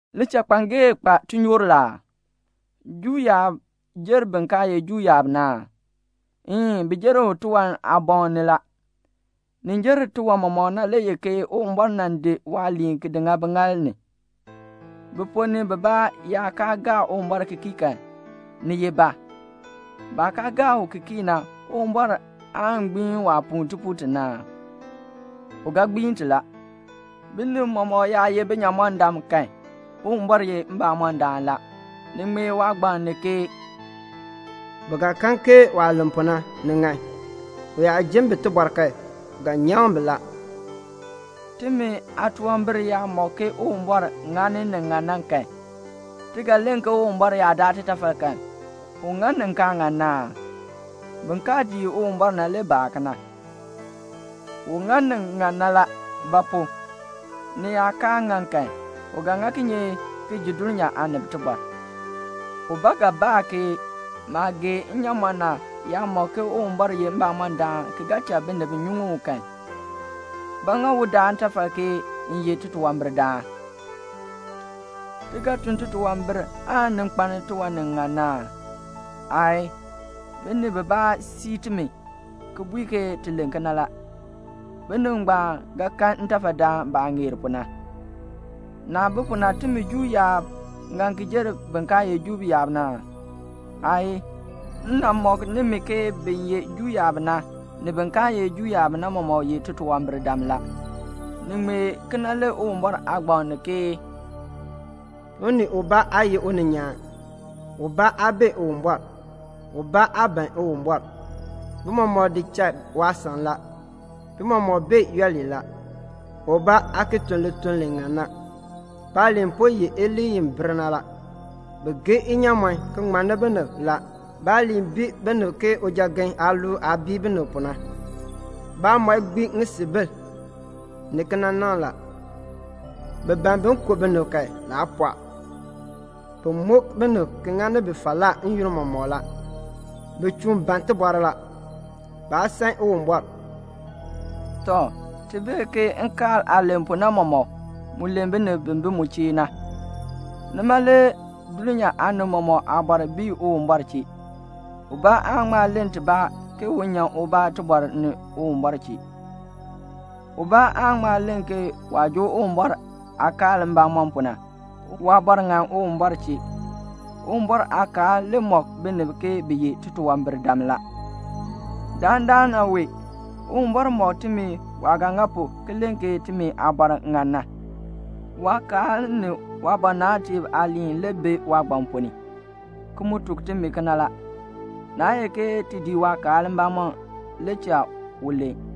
Lichakpangee kpa tinyoor la aa? Juu yaab jer bin kaa ye Juu yaab na aa? Een, bi jer bi tiwan aaboŋ ni la. Ni jer tiwan mɔmɔk na le ye ke Uwumbɔr nan di waaliin ki di ŋa biŋaal ni. Bi ponn ni bibaa yaa kaa gaa Uwumbɔr ki kii kan, ni ye ba? Baah kaa gaa u ki kii na, Uwumbɔr aan gbiin waa puu tipuul ti na aa? U ga gbiin ti la. Binib mɔmɔk yaa ye binyamɔndam kan, Uwumbɔr ye mbamɔndaan la. Ni ŋmee waagbaŋ ni ke "Bi ga kan ke waah len pu na, ni ŋan. U yaa jin bi tibɔr kan, u ga nyaŋ bi la." Timi aatunwambir yaa mɔk ke Uwumbɔr ŋani ni ŋan na kan, ti ga len ke Uwumbɔr yaa daa titafal kan, u ŋa ni kaa ŋan na aa? (Bin kaa dii Uwumbɔr na le baa kena.) U ŋa ni ŋan na la; ba pu? ni yaa kaa ŋan kan, u ga ŋa kinye ki ji dulnyaa aanib tibɔr? Ubaa ga baa ke "Maah gee nnyaamɔn na yaa mɔk ke Uwumbɔr ye mbamɔndaan ki ga cha binib nyuŋ u kan, ba ŋa u daa ntafal ke m ye titunwambirdaan?" Ti ga tun titunwambir aan ni kpaln tiwan ni ŋan na aa? Aayii. Binib bibaa sii timi ki bui ke ti len kena la. Binib ngbaan ga kan ntafadaan baah ŋeer pu na. Naah bi pu na, timi Juu yaab ŋan ki jer bin kaa ye Juu yaab na aa? Aayii. M nan mɔk nimi ke bin ye Juu yaab na, ni bin kaa ye Juu yaab na mɔmɔk ye titunwambirdam la. Ni ŋmee kena le Uwumbɔr Aagbaŋ ni ke "Unii ubaa aa ye uninyaan, ubaa aa bee Uwumbɔr, ubaa aa ban Uwumbɔr, bi mɔmɔk di cha waasan la, bi mɔmɔk bee yooli la. Ubaa aa bi ki tun lituln li ŋan na. Baaliin po ye iliin i bir na la. Bi geei inyaamɔn ki ŋmanni binib la. Baaliin bii binib ke ujagen aaluul aah bii binib pu na. Baamɔi gbiin ŋisiibil ni kinanaŋ la. Bi ban bin ku binib kan, naa pɔɔ. Bi muk binib ki ŋani bi falaa n-yoonn mɔmɔk la. Bi chuun ban tibɔr la. Baa san Uwumbɔr." Tɔ, ti bee ke nkaal aah len pu na mɔmɔk, mu len binib bi bi mu chee na. Nima le dulnyaa aanib mɔmɔk aabɔr bii Uwumbɔr chee. Ubaa aan ŋma len tibaa ke un nyan ubaa tibɔr ni Uwumbɔr chee. Ubaa aan ŋma len ke waah joo Uwumbɔr aakaal mbamɔm pu na, waabɔr ŋan Uwumbɔr chee. Uwumbɔr aakaal le mɔk binib ke bi ye titunwambirdam la. Dandana wee Uwumbɔr mɔk timi waah ga ŋa pu ki len ke timi aabɔr ŋan na. Waakaal ni waabɔnabtiib aaliin le bi waagbaŋ ponn ni, ki mu tuk timi kena la. Naa ye ke ti dii waakaal mbamɔm la le cha u len.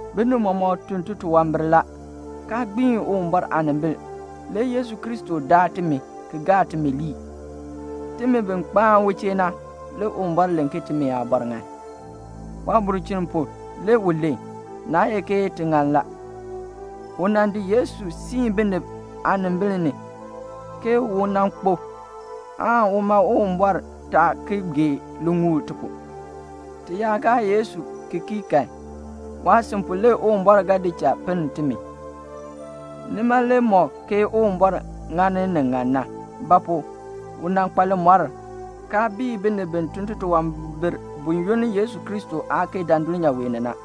binib mɔmɔk tun titunwambir la, kaa gbiin Uwumbɔr aanimbil. Le Yesu Kristo daa timi, ki gaa timi lii. Timi bi kpaan u chee na, le Uwumbɔr len ke timi aabɔr ŋan. Waabulchin pu le u len, naa ye ke ti ŋan la. U nan di Yesu siin binib aanimbil ni, ke u nan kpo, aan uma Uwumbɔr taa ki gee liŋuul ti pu. Ti yaa gaa Yesu ki kii kan, waasin pu le Uwumbɔr ga di cha pinn timi. Nima le mɔk ke Uwumbɔr ŋani ni ŋan na; ba pu? u nan kpa limɔr, kaa bii binib bi tun titunwambir buyoonn Yesu Kristo aa kee dan dulnyaa wee ni na.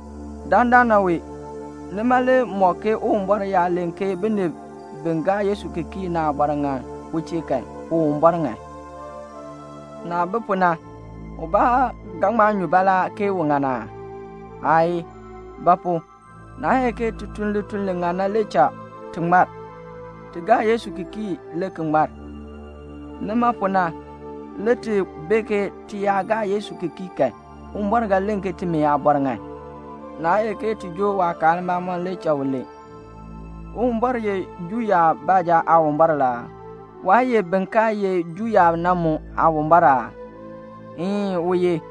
Dandana wee nima le mɔk ke Uwumbɔr yaa len ke binib bi gaa Yesu ki kii na aabɔr ŋan u chee kan, Uwumbɔr ŋan. Naah bi pu na, ubaa ga ŋma nyu baalaa ke u ŋan aa? Aayii. Ba pu? Naa ye ke ti tun lituln li ŋan na le cha ti ŋmar. Ti gaa Yesu ki kii le ki ŋmar. Nima pu na le ti bee ke ti yaa gaa Yesu ki kii kan, Uwumbɔr ga len ke timi aabɔr ŋan. Naa ye ke ti joo waakaal mbamɔm le cha u len. Uwumbɔr ye Juu yaab baanja Aawumbɔr la aa? Waa ye bin kaa ye Juu yaab na mu Aawumbɔr aa? Een, u ye.